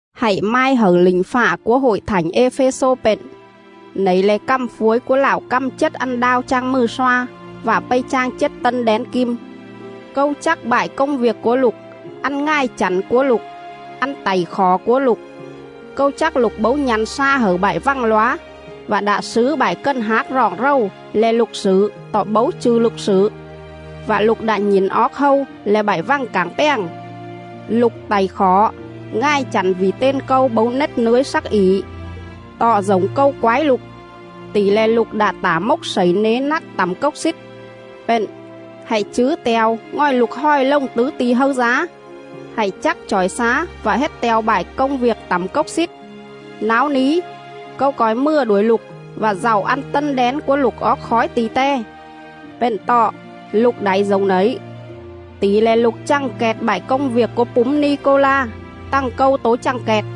“Hạy mai hẩư lỉnh fạ cúa Hội Thảnh Ê-phê-xô pện: Nẩy le̱ cằm phuối cúa Lạo căm chết ăn đao chang mừ sloa, vạ pây chang chết tân đén kim: ‘Câu chắc bại công viêc cúa lục, ăn ngài chẳn cúa lục, ăn tảy khỏ cúa lục. Câu chắc lục bấu nhă̱n sla hẩư bại vằng lóa, vạ đạ slứ bại cần hác roọng rầu le̱ lục slử tọ bấu chư̱ lục slử, vạ lục đạ nhỉn oóc hâu le̱ bại vằng cảng pjàng. Lục tảy khỏ, ngài chẳn vỉ ten Câu bấu nết nưới slắc ỉ. Tọ dổng Câu quái lục, tỉ le̱ lục đạ tả mốc slẩy nế nắt tẳm cốc xít. Pện, hạy chứ te̱o ngòi lục hòi lồng tứ ti̱ hâư dá! Hạy chắc chỏi xá vạ hết te̱o bại công viêc tẳm cốc xít. Náo ní, Câu co̱i mừa đuổi lục vạ dạu au tân đén cúa lục oóc khói ti̱ te. Pện tọ, lục đảy dổng nẩy: Tỉ le̱ lục chằng kẹt bại công viêc cúa púm Ni-cô-la, tằng Câu tố chằng kẹt.’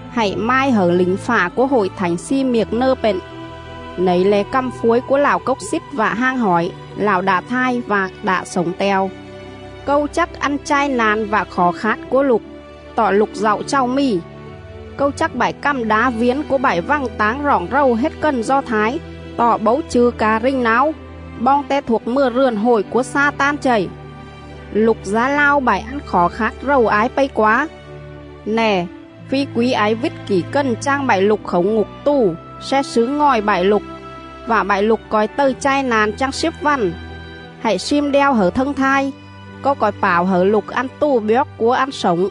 “Hạy mai hẩư lỉnh fạ cúa Hội Thảnh Xi-miệc-nơ pện: Nẩy le̱ cằm phuối cúa Lạo Cốc Xít vạ Hang Hỏi, Lạo đạ thai vạ đạ slổng te̱o:. ‘Câu chắc ăn chai na̱n vạ khỏ khát cúa lục, tọ lục dạu chàu mì! Câu chắc bại cằm đá viến cúa bại vằng táng roọng rầu hết cần Do Thái tọ bấu chư̱ ca rình náo, boong te thuộc mừa rườn hội cúa Xa-tan chầy. Lục dá lao bại ăn khỏ khát rầu ái pây quá. Nè, phi quí ái vít kỉ cần chang bại lục khảu ngục tù sle slứ ngòi bại lục; vạ bại lục co̱i tầư chai na̱n chang slíp vằn. Hạy slim đeo hẩư thâng thai, Câu co̱i pảo hẩư lục ăn tù bjoóc cúa ăn slổng.’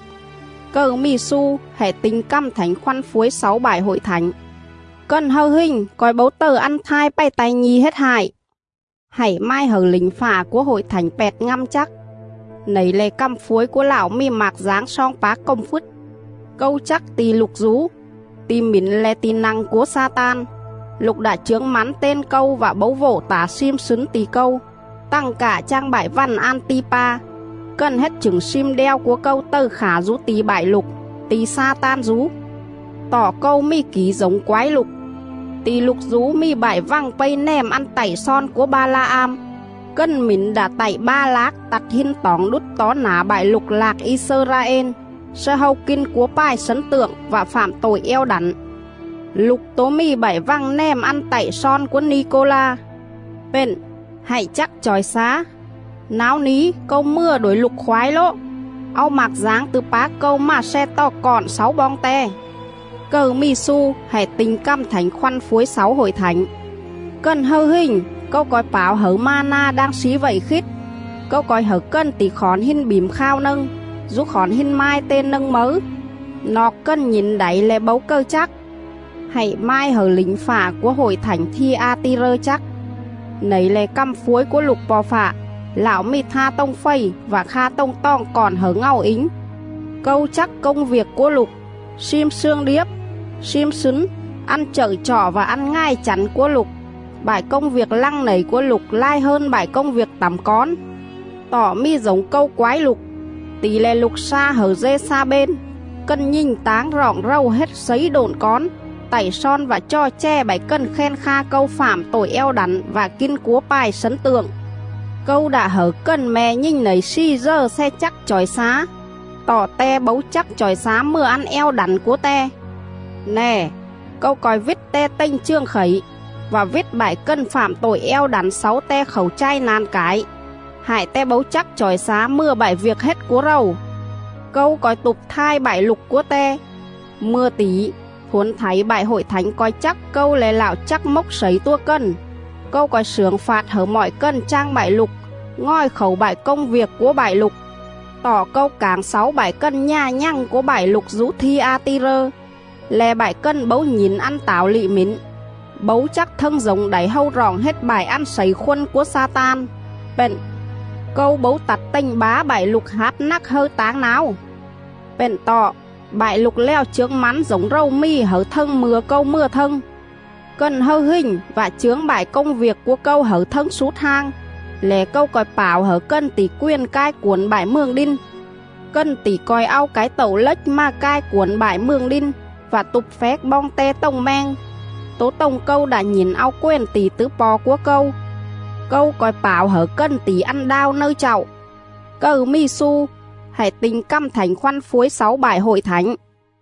Cầư mì xu, hạy ti̱nh cằm Thảnh Khoăn phuối xáu bại Hội Thảnh: ‘Cần hâư hình co̱i bấu tầư ăn thai pày ta̱i nhi̱ hết hại.’”. “Hạy mai hẩư lỉnh fạ cúa Hội Thảnh Pẹt-ngăm chắc: Nẩy le̱ cằm phuối cúa Lạo mì mạc dáng sloong pác cồm phứt: ‘Câu chắc ti̱ lục dú; ti̱ mỉn le̱ ti̱ nă̱ng cúa Xa-tan. Lục đạ chướng mắn ten Câu vạ bấu vộ tả slim slứn ti̱ Câu, tằng cạ chang bại vằn An-ti-pa, cần hết chửng slim đeo cúa Câu tầư khả dú ti̱ bại lục, ti̱ Xa-tan dú. Tọ Câu mì kỉ dổng quái lục: Ti̱ lục dú mì bại vằng pây nèm ăn tạy slon cúa Ba-la-am, cần mỉn đạ tạy Ba-lác tặt hin toỏng đút tó nả bại lục lạc I-xơ-ra-ên sle hâu kin cúa pài slấn tượng vạ fạm tội eo đẳn.. Lục tố mì bại vằng nèm ăn tạy slon cúa Ni-cô-la. Pện, hạy chắc chỏi xá! Náo ní, Câu mừa đuổi lục khoái lố, au mạc dáng tứ pác Câu mà sle tò cọn xáu boong te.’ Cầư mì xu, hạy ti̱nh cằm Thảnh Khoăn phuối xáu Hội Thảnh: ‘Cần hâư hình, Câu co̱i pảo hẩư ma-na đang slí vậy khít; Câu co̱i hẩư cần tỉ khỏn hin bỉm khao nâng, dú khỏn hin mai ten nâng mấư, noọc cần nhỉn đảy lẻ bấu cầư chắc.’”. “Hạy mai hẩư lỉnh fạ cúa Hội Thảnh Thi-a-ti-rơ chắc: Nẩy le̱ cằm phuối cúa Lục Po̱ Fạ, Lạo mì tha tồng fầy vạ kha tồng toòng cọn hẩư ngàu ính: ‘Câu chắc công viêc cúa lục, slim slương điếp, slim slứn, ăn chậư chọ vạ ăn ngài chẳn cúa lục; bại công viêc lăng nẩy cúa lục lai hơn bại công viêc tẳm cón. Tọ mì dổng Câu quái lục, tỉ le̱ lục sla hẩư Dê-xa-bên, cần nhình táng roọng rầu hết slấy độn cón, tạy slon vạ chò chè bại cần khen kha Câu fạm tội eo đẳn vạ kin cúa pài slấn tượng.. Câu đạ hẩư cần me̱ nhình nẩy slì dờ sle chắc chỏi xá, tọ te bấu chắc chỏi xá mừa ăn eo đẳn cúa te. Nè, Câu co̱i vít te tềnh chường khẩy, vạ vít bại cần fạm tội eo đẳn xáu te khảu chai na̱n cải, hại te bấu chắc chỏi xá mừa bại viêc hết cúa rầu. Câu co̱i tụp thai bại lục cúa te. Mư̱a tỉ, thuổn thảy bại Hội Thảnh co̱i chắc Câu le̱ Lạo chắc mốc slẩy tua cần; Câu co̱i slưởng fạt hẩư mọi cần chang bại lục ngòi khảu bại công viêc cúa bại lục.. Tọ Câu cảng xáu bại cần nhà nhằng cúa bại lục dú Thi-a-ti-rơ, le̱ bại cần bấu nhỉn ăn tảo lị mỉn, bấu chắc thâng dổng đảy hâu roọng hết bại ăn slẩy khôn cúa Xa-tan, pện: Câu bấu tặt tềnh bá bại lục háp nắc hâư táng náo. Pện tọ, bại lục lèo chướng mắn dổng rầu mì hẩư thâng mư̱a Câu mừa thâng. Cần hâư hình vạ chướng bại công viêc cúa Câu hẩư thâng slút hang lẻ Câu co̱i pảo hẩư cần tỉ quền cai cuổn bại mường đin; cần tỉ co̱i au cái tậu lếch mà cai cuổn bại mường đin, vạ tụp phéc boong te tồng meng, tố tồng Câu đạ nhỉn au quền tỉ tứ Po̱ cúa Câu. (LXX). Câu co̱i pảo hẩư cần tỉ ăn đao nâư chạu. Cầư mì xu, hạy ti̱nh cằm Thảnh Khoăn phuối xáu bại Hội Thảnh!’”